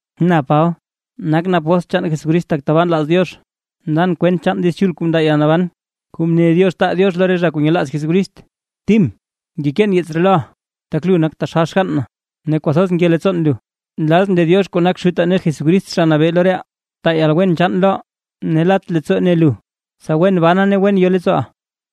Na Paba, nakʼn apóstl chaan Jesucrist tak tabaa nlaaz Diox, ndan kwent chaan Diiz Chul kuu ndaa yalnaban, kuu mne Diox taa Diox lo re zha kuu nyelaaz Jesucrist. Tim ngekeen yeets ree loʼa, tak lu nak taxal xgann na, ne kwathoz nke leettsoon lu. Nlazʼn lee Diox kuu nak Xutaa ne Jesucrist Zha Nabee lo reʼaa, taa yalwen chaan loʼa, ne lat leettsoo ne lu, tsa wen bana ne wen yo leettsooʼa.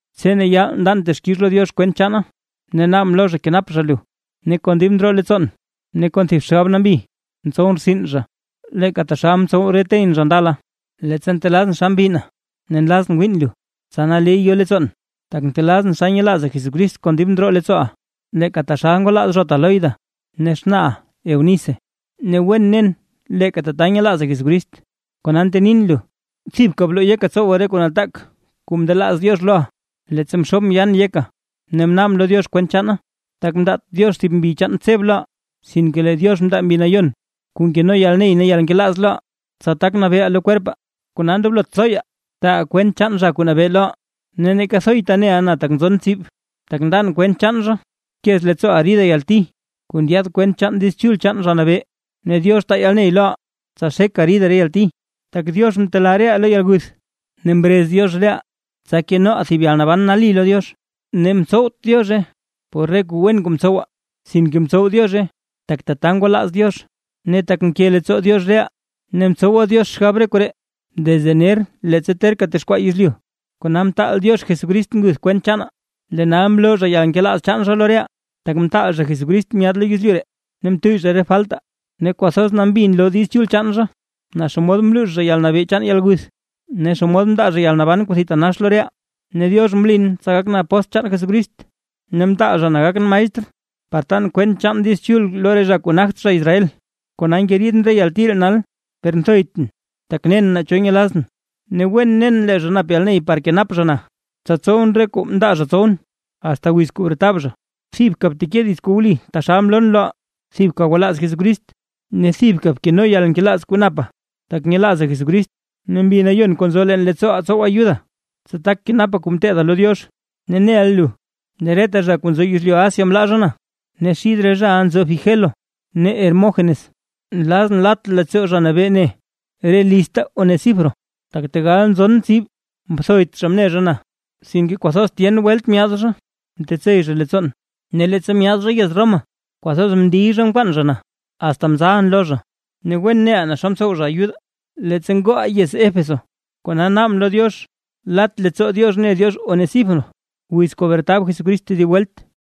Tse ne yaal ndan texkix lo Diox kwent chaana ne naabʼn lo zha kenap zha lu. Ne kon dib ndroo leettsoon ne kon thib xgab nambi ntsowʼn rtsin zha, leeka taxal mtsow re teyʼn zha ndala. Leettsa ntelazʼn xa mbinna ne nlazʼn wiin lu, tsa naley yo leettsoon. Tak ntelazʼn xa nyelaaza Jesucrist kon dib ndroo leettsooʼa, leeka taxal ngwalaaz zhota Loida ne xnaaʼa Eunice. Ne wen nen leeka tata nyelaaza Jesucrist. Kona ntenin lu, thibka bloo yeka tsowa re kuu nataak kuu mndelaaz Diox loʼa, leettsa mxoobʼn yaan yeka ne mnaabʼn lo Diox kwent chaana. Tak mndaat Diox thib mbi chaan tseb loʼaa, sinke lee Diox mndaa Mbi Nayon kuu nkeno yalney ne yalnkelaaz loʼaa, tsa tak nabeeʼaa lo kwerpaa. Kona ndoblot thoya taaʼa kwent chaan Zha Kuu Nabee loʼaa, ne neeka thoyta neʼa na tak nzon tsib, tak ndan kwent chaan zha. Bkez leettsooʼa rida yalti kuu ndyaad kwent chaan Diiz Chul chaan Zha Nabee, ne Diox taa yalney loʼa tsa xeka rida re yalti. Tak Diox mtelaa reʼaa lo yalguth, ne mrez Diox reʼaa tsa kenoʼaa thib yalnaban nali lo Diox. Ne mtsowt Diozhe por re kuu wen kuu mtsowaa, sinke mtsow Diozhe tak tata ngwalaaz Diox, ne tak mke leettsoo Diox reʼaa, ne mtsowa Diox xgab koree desde ner leettsa terka texkwaa yezlyu, kona mtaal Diox Jesucrist nguth kwent chaanaa, lee nal mloo zha yalnkelaaz chaan zha lo reʼaa, tak mtaal zha Jesucrist myaad lo yezlyu ree, ne mtuyy zha re faltaa. Ne kwathoz nambi nloo Diiz Chul chaan zha, naa xomod mluux zha yalnabee chaan yalguth, ne xomod mndaa zha yalnaban kuu thitanax lo reʼaa. Ne Diox mlin tsa gakʼn apóstl chaan Jesucrist, ne mtaal zha na gakʼn maestr, par tan kwent chaan Diiz Chul lo re zha kuu nagt zha Israel. Kona ngeriidʼn re yalti ree nal. Per nthoytʼn, tak nen naa cho nyelazʼn, ne wen nen lee zha nap yalney par kenap zha na, tsa tsowʼn re kuu mndaa zha tsowʼn, asta wiz kuu bretab zha. Thibka bteke dits kuu wli taxal mloon loʼa; thibka gwalaaz Jesucrist, ne thibka bkeno yalnkelaaz kuu napaa, tak nyelaazaa Jesucrist. Ne Mbi Nayon kuu nzo leen leettsooʼaa tsow ayuda, tsa tak kenapa kuu mteeda lo Diox. Ne neʼa lu lee reta zha kuu nzo yezlyu Asia mlaa zha na, ne xid re zhaʼa nzo Figelo ne Hermógenos. Nlazʼn lat leettsoo Zha Nabee ne re lizta Onesíforo, tak tegal nzon tsib mthoyt zha mne zha na. Sinke kwathoz tyen welt myaad zha mtetsey zha leettsoon. Ne leettsa myaad zha yez Roma, kwathoz mndiy zha mkwaan zha na, asta mzalʼn lo zha. Ne wen neʼa naa xa mtsow zha ayudaa leettsa ngooʼaa yez Éfeso. Kona naabʼn lo Diox lat leettsoo Diox ne Diox Onesíforo, wiz kuu bretab Jesucrist tedib welt.